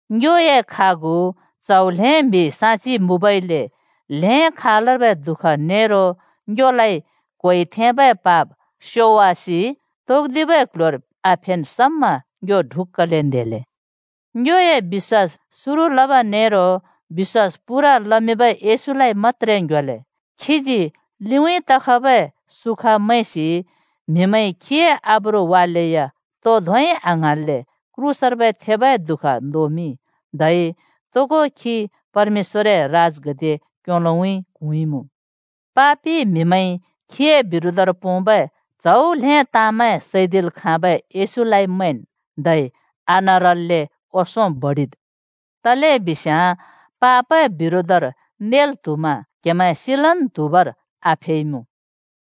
ङ्योए खागु च्‍हौ ल्‍हें म्हि साक्षि मुँबइले, ताँन् खालर्बै दुःख नेरो ङ्योलाइ क्होइ थेंबै पाप स्योवासि तौदिबै क्‍ल्‍ह्‍योर आफेन् समा ङ्यो ढुक्‍कले न्हेले। ङ्योए बिश्‍वास सुरु लब नेरो बिश्‍वास पूरा लमिंबै येशूलाइ मत्‍त्रे ङ्ह्‍योले। खीजी लिउँइँ तखबै सुखा मैंसि म्हिमैंइ खीए आब्रु वालेया तो धोंइ आङ्हाँन्ले क्रूसर्बै थेबै दुःख नोमिंइ। धै तोगो खी परमेश्‍वरए राजगद्दिए क्‍योलोउँइँ क्हुँइमुँ। पापि म्‍हिमैंइ खीए बिरोधर पोंबै च्‍हौ ल्‍हें ताँमैं सैदिल् खाँबै येशूलाइ मैंन्, धै आनरल्‍ले ओंसों बडिद्। तलेबिस्याँ पापए बिरोधर नेल् त्हुमा क्हमैं सिलन् त्हुबर आफेइमुँ।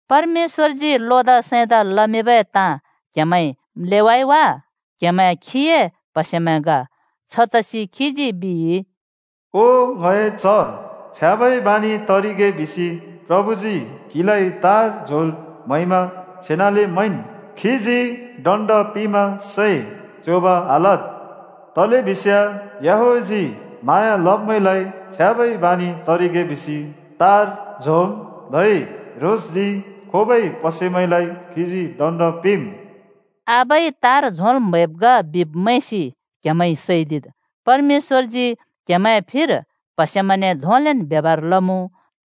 परमेश्‍वरजी लोदा सैंदा लमिंबै ताँ क्हेमैंइ म्‍लेवाइ वा? क्हेमैं खीए प्हसेमैं ग। छतसि खीजी बिइ, “ओ ङए च्‍ह, छ्याँबै बानि तरिगे बिसि प्रभुजी क्‍हिलाइ तार झोंल् म्हैमा छेनाले मैंन्, खीजी दण्ड पिंमा सैं च्योंब आलद्। तलेबिस्याँ याहवेहजी म्हाँया लब्‍मैंलाइ छ्याँबै बानि तरिगे बिसि तार झोंम्, धै ह्रोंसजी खोबै प्हसेमैंलाइ खीजी दण्ड पिंम्।” आबाइ तार झोंल् म्हैब् ग बिब् मैंसि क्‍हेमैंइ सैदिद्। परमेश्‍वरजी क्‍हेमैंए फिर प्‍हसेमैंने धोंलेन् ब्यबहार लमुँ।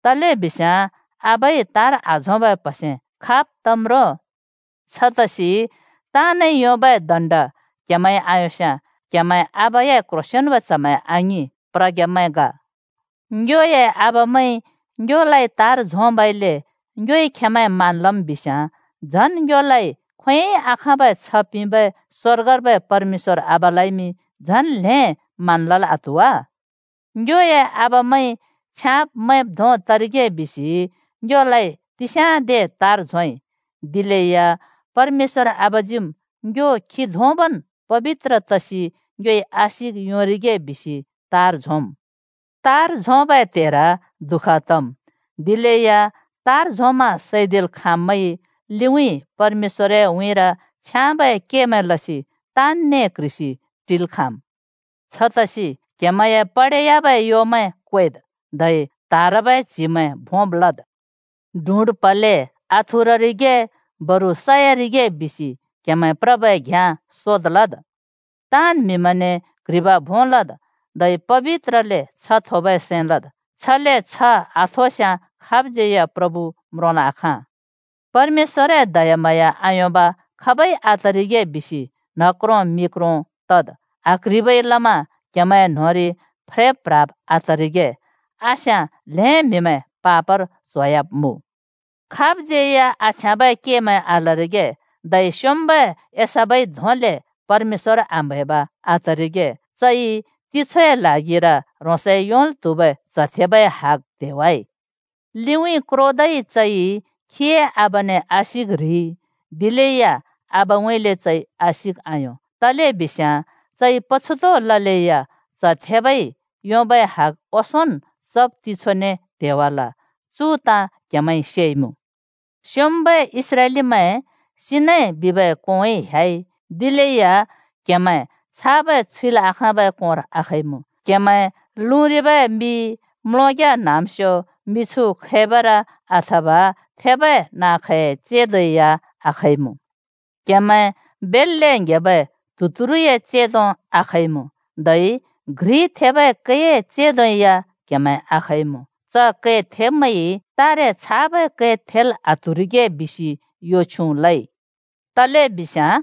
तलेबिस्याँ आबाइ तार आझोंबै प्हसे खाब् तम् रो? छतसि ताँनइ योंबै दण्ड क्‍हेमैंइ आयोंस्याँ क्‍हेमैं आबाए क्ह्रोंसेंन्बै च्‍हमैं आङिं, प्रग्‍यामैं ग। ङ्योए आबामैंइ ङ्योलाइ तार झोंबइले ङ्योइ खेंमैं मान लम् बिस्याँ झन् ङ्योलाइ खोंयोंइ आखाँबै छ्ह पिंबै स्वर्गर्बै परमेश्‍वर आबालाइमि झन ल्हें मान लल् आत्हु वा? ङ्योए आबामैंइ छ्याँब् मैंब् धों तरिगे बिसि ङ्योलाइ तिस्याँदे तार झोंइ। दिलेया परमेश्‍वर आबाजीम् ङ्यो खी धोंबन् पबित्र तसि ङ्योइ आशिक योंरिगे बिसि तार झोंम्। तार झोंबै त्हेर दुःख तम्, दिलेया तार झोंमा सैदिल् खाँब्मैंइ लिउँइँ परमेश्‍वरए उँइँर छ्याँबै केमैं लसि ताँनने क्ह्रिसि टिल् खाँम्। छतसि क्‍हेमैंए पडेयाबै योमैं क्वेद्, धै त्हारबै च्‍हिमैं भोंब् लद्। डुड् प्हले आथुररिगे, बरु सयारिगे बिसि क्हेमैं प्रबै घ्‍याँ सोद् लद्। ताँन् म्‍हिमैंने क्ह्रिब भों लद्, धै पबित्रले छ्ह थोबै सैं लद्। छले छ्ह आथोस्‍याँ खाबज्‍यै या प्रभु म्रोंल् आखाँ। परमेश्‍वरए दयाम्हाँया आयोंब खाबै आतरिगे बिसि न्ह क्रों मि क्रों तद्। आक्ह्रिबै लमा क्हेमैंए न्होंरि फ्रेब् प्ह्राब् आतरिगे। आस्याँ ल्हें म्हिमैं पापर च्होयाब्मुँ। खाबज्यै या आछ्याँबै केमैं आलरिगे धै स्‍योंम्‍बै एसाव धोंबै परमेश्‍वर आम्हैब आतरिगे। चइ तिछोए ल्हागिर ह्रोंसइ योंल् त्हुबै च्ह थेबाए हग त्हेवाइ। लिउँइँ क्रोदै चइ चए आबाने आशिक ह्रिइ दिलेया आबाउँइँले चइ आशिक आयों। तलेबिस्याँ चइ पछुत ललेया च्ह थेबाइ योंबै हग ओंसोंन् चब् तिछोने त्हेवाल। चु ताँ क्हेमैंइ सेइमुँ। स्‍योंम्‍बै इस्राएलीमैं सिनै बिबै कोंउँइँ ह्‍याइ, दिलेया क्‍हेमैं छाबै छुइल् आँखाँबै कोंर आखइमुँ। क्हेमैं लुँरिबै मि, म्‍लोंग्‍या न्‍हाँम्‍स्यो, मिछु खैबर अथवा थेबै नाँ-खैंए चेंदो या आखइमुँ। क्हेमैं बेल्‍ले ङ्‍हेबै त्हुतुरुए चेंदो आखइमुँ, धै थेबै कै घ्रिए चेंदो या क्हेमैं आखइमुँ। च कै थेब्मैंइ “तारे छाबै कै थेल् आत्हुरिगे,” बिसि यो छ्युँ लइ, तलेबिस्याँ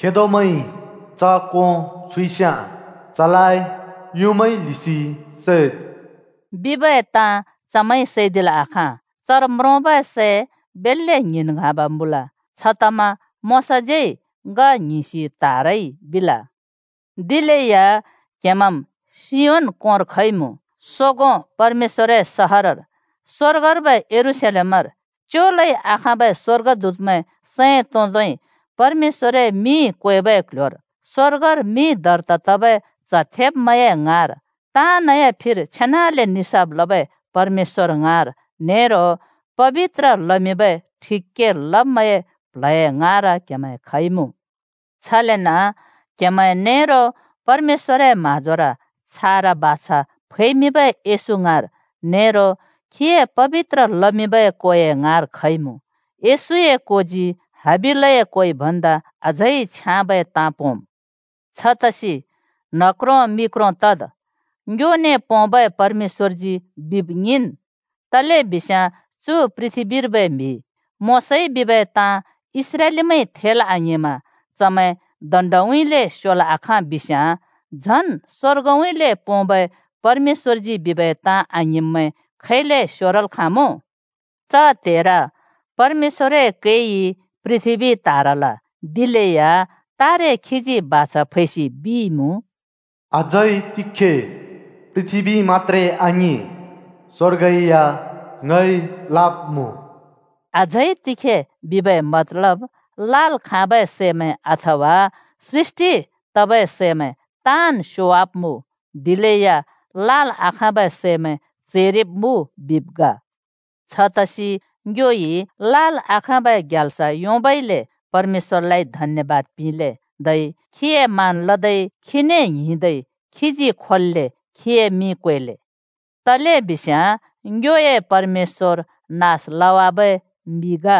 “खेदोज्यै या च कों छुइस्याँ, चलाइ युँमाइ ल्हिसि सैद्,” बिबै ताँ चमैंइ सैदिल् आखाँ। चर म्रोंबै सै बेल्‍ले ङ्हिंन् ङ्हाँब मुँल, छतमा मोशाज्यै “ङ ङ्हिंसि त्‍हारइ” बिल। दिलेया क्हेमैंम् सियोन कोंर खइमुँ, सोगों परमेश्‍वरए सहरर, स्‍वर्गर्बै यरूशलेमर, च्योलै आखाँबै स्‍वर्गदूतमैं सैं तोंदै परमेश्‍वरए मिं क्वेबै क्ल्ह्‍योर, स्वर्गर मिं दर्ता तबै च्‍ह थेब्मैंए ङाँर, ताँनए फिर छेनाले निसाफ लबै परमेश्‍वर ङाँर नेरो पबित्र लमिंबै ठिक के लब्मैंए प्ल्हए ङाँर क्हेमैं खइमुँ। छलेन क्हेमैं नेरो परमेश्‍वरए म्हाँजोर छारा बाछा फैमिंबै येशू ङाँर नेरो खीए पबित्र लमिंबै कोए ङाँर खइमुँ। येशूए कोजी हाबिलए कोइ भन्दा अझै छ्याँबै ताँ पोंम्। छतसि न्ह क्रों मि क्रो तद्, ङ्योने पोंबै परमेश्‍वरजी बिब ङिंन्। तलेबिस्याँ चु पृथ्‍बीर्बै म्‍हि मोशाइ बिबै ताँ इस्राएलीमैंइ थेल् आङिंमा चमैं दण्‍डउँइँले स्योल् आखाँ बिस्याँ, झन् स्‍वर्गउँइँले पोंबै परमेश्‍वरजी बिबै ताँ आङिंब्मैं खैले स्योरल् खाँमुँ? च त्हेर परमेश्‍वरए कैइ पृथ्‍बी त्हारल, दिलेया तारे खीजी बाछा फैसि बिइमुँ, “अझै तिखे पृथ्‍बी मत्‍त्रे आङिं, स्‍वर्ग या ङइ लाब्‍मुँ।” “अझै तिखे” बिबै मतलब, लाल् खाँबै सैमैं, अथवा सृष्‍टि तबै सैमैं ताँन् स्‍योवाब्‍मुँ, दिलेया लाल् आखाँबै सैमैं चैरिब्मुँ बिब् ग। छतसि ङ्योइ लाल् आखाँबै ग्याल्स योंबइले परमेश्‍वरलाइ धन्‍यबाद पिंले, धै खीए मान लदै खीने ङ्हिंदै खीजी खोल्‍ले खीए मिं क्वेले। तलेबिस्याँ ङ्योए परमेश्‍वर नास लवाबै मि ग।